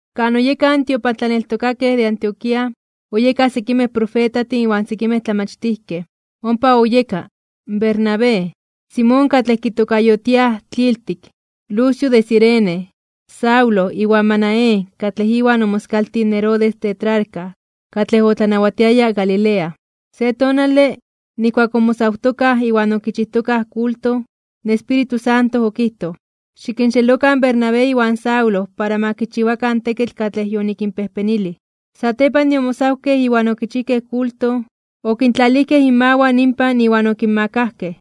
Kan oyekaj in tiopantlaneltokakej de Antioquía, oyekaj sekimej profetajtin iwan sekimej tlamachtijkej. Ompa oyeka: Bernabé, Simón katlej okitokayotiayaj Tliltik, Lucio de Cirene, Saulo iwan Manaén katlej iwan omoskaltij in Herodes tetrarca, katlej otlanawatiaya Galilea. Se tonale, nijkuak omosawtokaj (oayunarojtokaj) iwan okichijtokaj kulto, in Espíritu Santo okijtoj: ―Xikinxelokan in Bernabé iwan Saulo para ma kichiwakan in tekitl katlej yonikinpejpenilij. Satepan de omosawkej iwan okichijkej kulto, okintlalijkej inmawan inpan iwan okinmakajkej.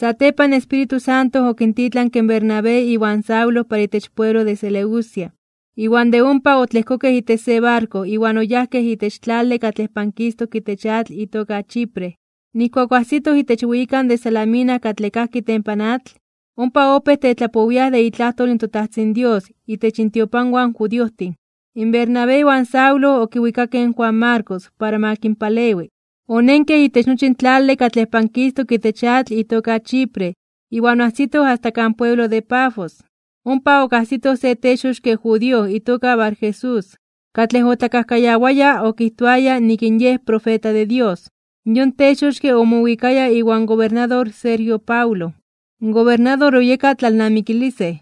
Satepan in Espíritu Santo okintitlanke in Bernabé iwan Saulo para itech pueblo de Seleucia, iwan de ompa otlejkokej itech se barko iwan oyajkej itech tlale katlej pankistok itech atl itoka Chipre. Nijkuak oajsitoj itech weyikan de Salamina katlej kajki itempan atl. Ompa opéj tetlapowiaj de itlajtol in toTajtzin Dios itech intiopanwan in judiojtin. Bernabé iwan Saulo okiwikakej in Juan Marcos para ma kinpalewi. Onenkej itech nochi in tlale katlej pankistok itech atl itoka Chipre iwan oajsitoj asta kan pueblo de Pafos, ompa okajsitoj se texoxke (brujo) judío itoka Barjesús, katlej otlakajkayawaya okijtoaya nik in yej profeta de Dios. Yon texoxke omowikaya iwan gobernador Sergio Paulo, in gobernador oyeka tlalnamikilisej.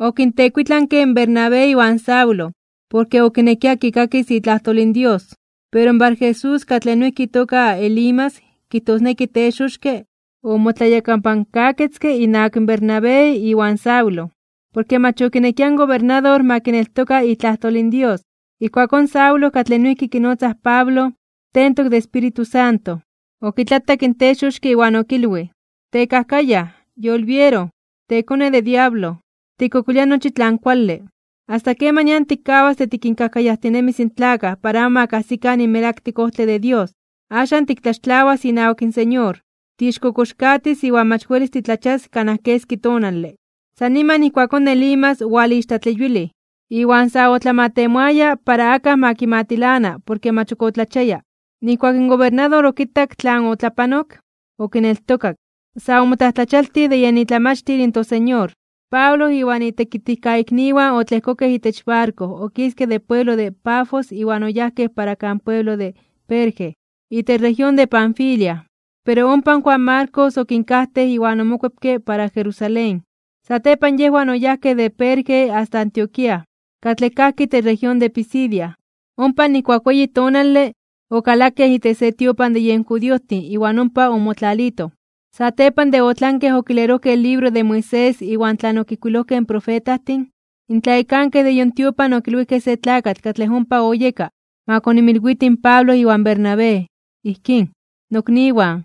Okintekuitlanke in Bernabé iwan Saulo, porke okinekia kikakis itlajtol in Dios. Pero Barjesús katlej noijki itoka Elimas kijtosneki texoxke, omotlayakapankaketzke innawak in Bernabé iwan Saulo, porke mach okinekia in gobernador ma kineltoka itlajtol in Dios. Ijkuakón in Saulo katlej noijki kinotzaj Pablo, tentok de Espíritu Santo, okitlatak in texoxke iwan okilwij: ―¡Tekajkayaj! ¡Yolbiero! ¡Tekone de diablo! ¡Tikkokolia nochi tlan kuale! ¿Asta kemanian tikkawas de tikinkajkayajtinemis in tlakaj para amo ma kajsikan in melaktik ojtle de Dios? Axan tiktlaxtlawas inawak in Señor, tiixkokoxkatis (tiixpachitis) iwan mach welis titlachias kanaj keski tonale. San niman ijkuakón Elimas owalixtlatleyuilij (owalixtlatlayowilij), iwan sa otlamatemoaya para akaj ma kimatilana porke mach ok otlachiaya. Nijkuak in gobernador okitak tlan otlapanok, okineltokak. Sa omotlajtlachialtij (omomajmawtij) de yen itlamachtil in toSeñor. Pablo iwan itekitijkaikniwan otlejkokej itech barko okiskej de pueblo de Pafos iwan oyajkej para kan pueblo de Perge, itech región de Panfilia. Pero ompa in Juan Marcos okinkajtej iwan omokuepke para Jerusalén. Satepan yejwan oyajkej de Perge asta Antioquía, katlej kajki itech región de Pisidia. Ompa nijkuak weyi tonale, okalakej itech se tiopan de yen judiojtin iwan ompa omotlalitoj. Satepan de otlankej okilerojkej in libro de Moisés iwan tlan okijkuilojkej in profetajtin, in tlayekankej de yon tiopan okilwijkej se tlakatl katlej ompa oyeka ma koninmilwiti in Pablo iwan Bernabé, ijkín: ―Nokniwan,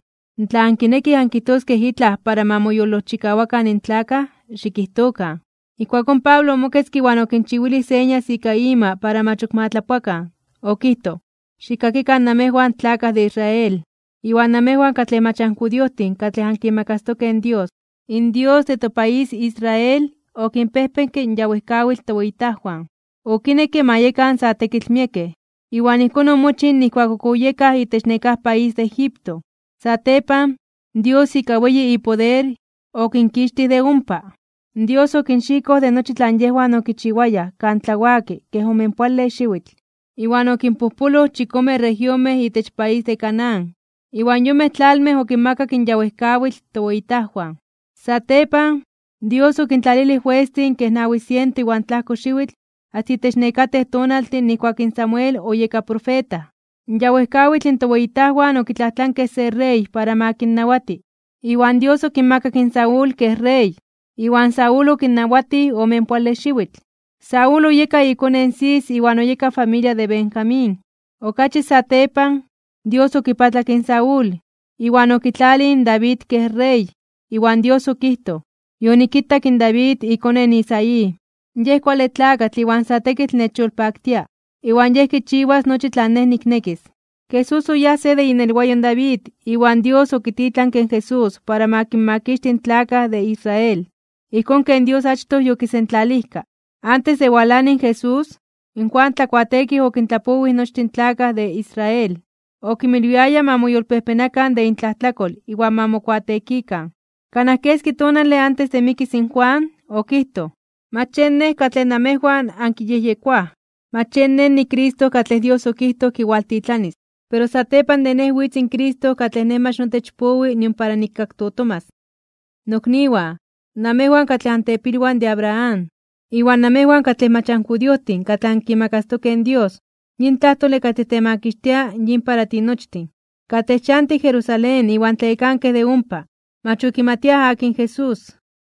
tla ankinekij ankijtoskej itlaj para ma moyolojchikawakan in tlakaj, xikijtokan. Ijkuakón Pablo omoketzke iwan okinchiwilij señas ika ima para mach ok ma tlapoakan. Okijtoj: ―Xikkakikan namejwan tlakaj de Israel, iwan namejwan katlej mach anjudiojtin katlej ankimakastokej in Dios. In Dios de topaís Israel okinpejpenke in ya wejkawitl toweyitajwan. Okinekke ma yekan sa tekitl miekej, iwan ijkón omochij nijkuak ok oyekaj itech nekáj país de Egipto. Satepan, Dios ika weyi ipoder, okinkixtij de ompa. Dios okinxikoj de nochi tlan yejwan okichiwayaj kan tlawaki kej omenpoale xiwitl, iwan okinpojpoloj chikome regionmej itech país de Canaán, iwan yonmej tlalmej okinmakak in ya wejkawitl toweyitajwan. Satepan, Dios okintlalilij juestin kej nawi siento iwan tlajko xiwitl asta itech nekatej tonaltin nijkuak in Samuel oyeka profeta. In ya wejkawitl toweyitajwan okitlajtlankej se rey para ma kinnawati, iwan Dios okinmakak in Saúl kej rey, iwan Saúl okinnawatij omenpoale xiwitl. Saúl oyeka ikone in Cis iwan oyeka familia de Benjamín. Okachi satepan, Dios okipatlak in Saúl, iwan okitlalij in David kej rey, iwan Dios okijtoj: “Yonikitak in David ikone in Isaí, yej kuale tlakatl iwan sa tekitl nechyolpaktia, iwan yej kichiwas nochi tlan Nej niknekis.” ’Jesús oyeka se de inelwayo in David iwan Dios okititlanke in Jesús para ma kinmakixti in tlakaj de Israel, ijkón ken Dios achtoj yokisentlalijka. Antes de walani in Jesús, in Juan Tlakuateekij okintlapowij nochtin in tlakaj de Israel, okinmilwiaya ma moyolpejpenakan (ma moyolkuepakan) de intlajtlakol iwan ma mokuateekikan. Kanaj keski tonale antes de mikis in Juan, okijtoj: “Mach yen nej katlej namejwan ankiyejyekoaj. Mach yen nej niCristo katlej Dios okijtoj kiwaltitlanis. Pero satepan de nej witz in Cristo katlej nej mach notech powi nion para nikkaktotomas.” ’Nokniwan, namejwan katlej antepilwan de Abraham, iwan namejwan katlej mach anjudiojtin katlej ankimakastokej in Dios, yin tlajtole katlej temakixtia yin para tinochtin. Katlej chantij Jerusalén iwan tlayekankej de ompa, mach okimatiaj akin Jesús,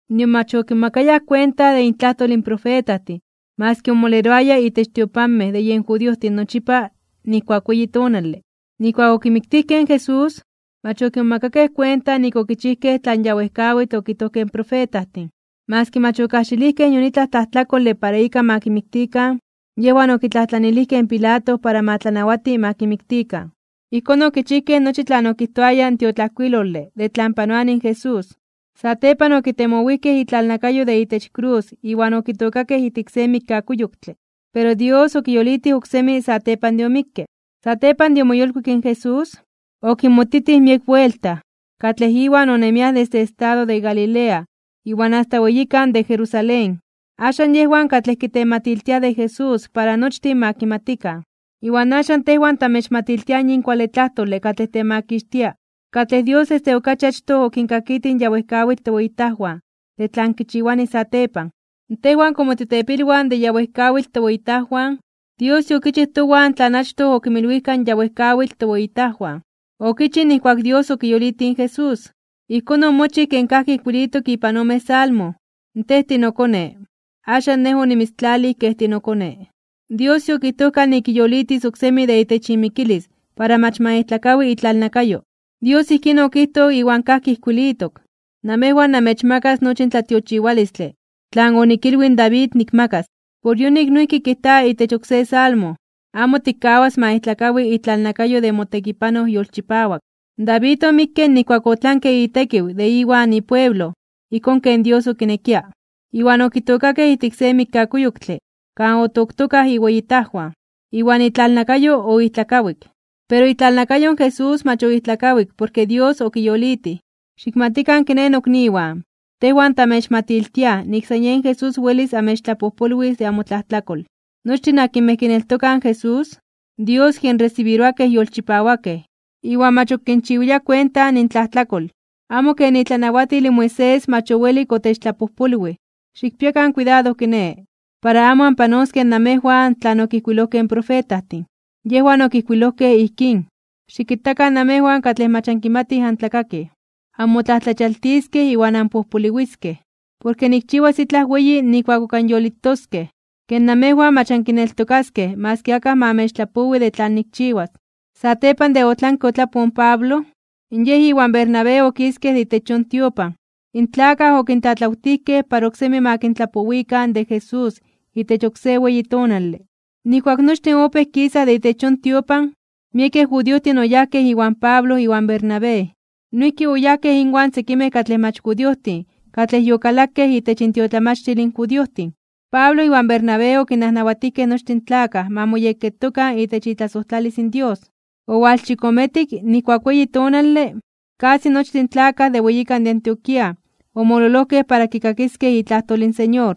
nion mach okimomakayaj kuenta de intlajtol in profetajtin maski omoleroaya itech tiopanmej de yen judiojtin nochipa nijkuak weyi tonale. Nijkuak okimiktijkej in Jesús, mach okimomakakej kuenta nik okichijkej tlan ya wejkawitl okijtojkej in profetajtin. Maski mach okajxilijkej nion itlaj tlajtlakole para ika ma kimiktikan, yejwan okitlajtlanilijkej in Pilato ma tlanawati ma kimiktikan. Ijkón okichijkej nochi tlan okijtoaya in tiotlajkuilole de tlan panoani in Jesús. Satepan okitemowijkej itlalnakayo de itech krus iwan okitookakej ijtik se mikkakuyoktle. Pero Dios okiyolitij oksemi satepan de omikke. Satepan de omoyolkuik in Jesús, okinmotitij miek buelta, katlej Iwan onemiaj desde estado de Galilea iwan asta weyikan de Jerusalén. Axan, yejwan katlej kitematiltiaj de Jesús para nochtin ma kimatikan. ’Iwan axan tejwan tamechmatiltiaj yin kuale tlajtole katlej temakixtia, katlej Dios desde okachi achtoj okinkakitij in ya wejkawitl toweyitajwan de tlan kichiwani satepan. Tejwan komo titepilwan de ya wejkawitl toweyitajwan, Dios yokichij towan tlan achtoj okinmilwijka in ya wejkawitl toweyitajwan. Okichij nijkuak Dios okiyolitij in Jesús. Ijkón omochij ken kajki ijkuilitok ipan ome salmo: “Tej tinoKone, axan Nej onimitztlalij kej tinoKone.” Dios yokijtojka nik kiyolitis oksemi de itech imikilis para mach ma ijtlakawi itlalnakayo, Dios ijkín okijtoj iwan kajki ijkuilitok: “Namejwan namechmakas nochi in tlatiochiwalistle tlan onikilwij in David nikmakas.” Por yonik noijki kijta itech oksé Salmo: “Amo tikkawas ma ijtlakawi itlalnakayo de motekipanoj yolchipawak.” David omikke nijkuak otlanke itekiw de iwan ipueblo ijkón ken Dios okinekia. Iwan okitookakej ijtik se mikkakuyoktle kan otoktokaj iweyitajwan, iwan itlalnakayo oijtlakawik. Pero itlalnakayo in Jesús mach oijtlakawik porke Dios okiyolitij. Xikmatikan kiné nokniwan, tejwan tamechmatiltiaj nik san yen Jesús welis amechtlapojpolwis de amotlajtlakol. Nochtin akinmej kineltokaj in Jesús, Dios kinresibiroa kej yolchipawakej, iwan mach ok kinchiwilia kuenta intlajtlakol, amo ken itlanawatil in Moisés mach owelik otechtlapojpolwij. Xikpiakan kuidado kiné, para amo anpanoskej namejwan tlan okijkuilojkej in profetajtin. Yejwan okijkuilojkej ijkín: Xikitakan, namejwan katlej mach ankimatij antlakakij, anmotlajtlachialtiskej (onmomajmawtiskej) iwan anpojpoliwiskej, porke nikchiwas itlaj weyi nijkuak ok anyolitoskej, ke namejwan mach ankineltokaskej maski akaj ma anmechtlapowi de tlan nikchiwas. Satepan de otlanke otlapoj in Pablo, yej iwan Bernabé okiskej de itech yon tiopan. In tlakaj okintlatlawtijkej para oksemi ma kintlapowikan de Jesús itech oksé weyi tonale. Nijkuak nochtin opéj kisaj de itech yon tiopan, miekej judiojtin oyajkej iwan Pablo iwan Bernabé. Noijki oyajkej inwan sekimej katlej mach judiojtin katlej yokalakej itech intiotlamachtil in judiojtin. Pablo iwan Bernabé okinnajnawatijkej nochtin in tlakaj ma moyekketokan itech itlasojtlalis in Dios. Owalchikometik, nijkuak weyi tonale, kasi nochtin in tlakaj de weyikan de Antioquía omololojkej para kikakiskej itlajtol in Señor.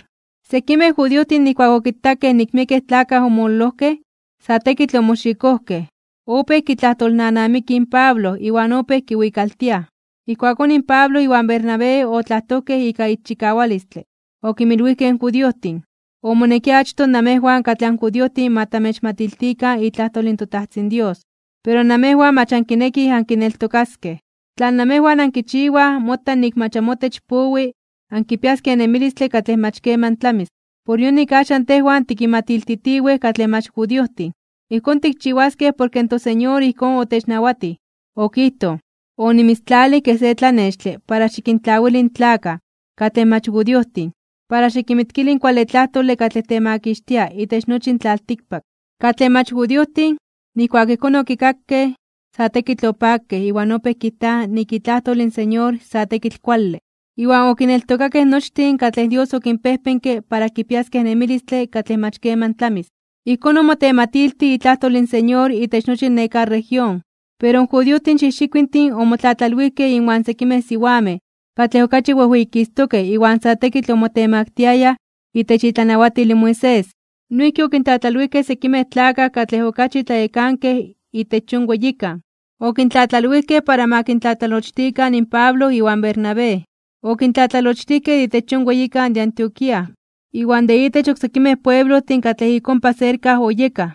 Sekimej judiojtin nijkuak okitakej nik miekej tlakaj omololojkej, sa tekitl omoxikojkej. Opéj kitlajtolnanamikij in Pablo iwan opéj kiwikaltiaj. Ijkuakón in Pablo iwan Bernabé otlajtojkej ika ixchikawalistle. Okinmilwijkej in judiojtin: ―Omonekia achtoj namejwan katlej anjudiojtin ma tamechmatiltikan itlajtol in toTajtzin Dios. Pero namejwan mach ankinekij ankineltokaskej. Tlan namejwan ankichiwaj mota nik mach amotech powi ankipiaskej in nemilistle katlej mach keman tlamis. Por yonik axan tejwan tikinmatiltitiwej katlej mach judiojtin. Ijkón tikchiwaskej porke in toSeñor ijkón otechnawatij, okijtoj: Onimitztlalij kej se tlanextle para xikintlawili in tlakaj katlej mach judiojtin, para xikinmitkili in kuale tlajtole katlej temakixtia itech nochi in tlaltikpak. Katlej mach judiojtin, nijkuak ijkón okikakej, sa tekitl opakej iwan opéj kijtaj nik itlajtol in Señor sa tekitl kuale. Iwan okineltokakej nochtin katlej Dios okinpejpenke para kipiaskej nemilistle katlej mach keman tlamis. Ijkón omotematiltij itlajtol in Señor itech nochi nekáj región. Pero in judiojtin xijxikuintin omotlatlalwijkej inwan sekimej siwamej katlej okachi wejweyikistokej iwan sa tekitl omotemaktiayaj itech itlanawatil in Moisés. Noijki okintlatlalwijkej sekimej tlakaj katlej okachi tlayekankej de itech yon weyikan. Okintlatlalwijkej para ma kintlatlalochtikan in Pablo iwan Bernabé. Okintlatlalochtijkej de itech yon weyikan de Antioquía iwan de itech oksekimej pueblojtin katlej ik ompa serka oyekaj.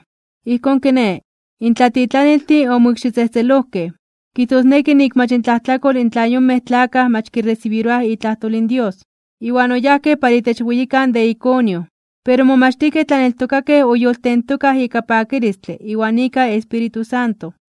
Ijkón kiné, in tlatitlaniltin omoikxitzejtzelojkej, kijtosneki nik mach intlajtlakol tla in yonmej tlakaj mach kiresibiroaj itlajtol in Dios. Iwan oyajkej para itech weyikan de Iconio. Pero in momachtijkej tlaneltokakej oyoltentokaj ika pakilistle iwan ika Espíritu Santo.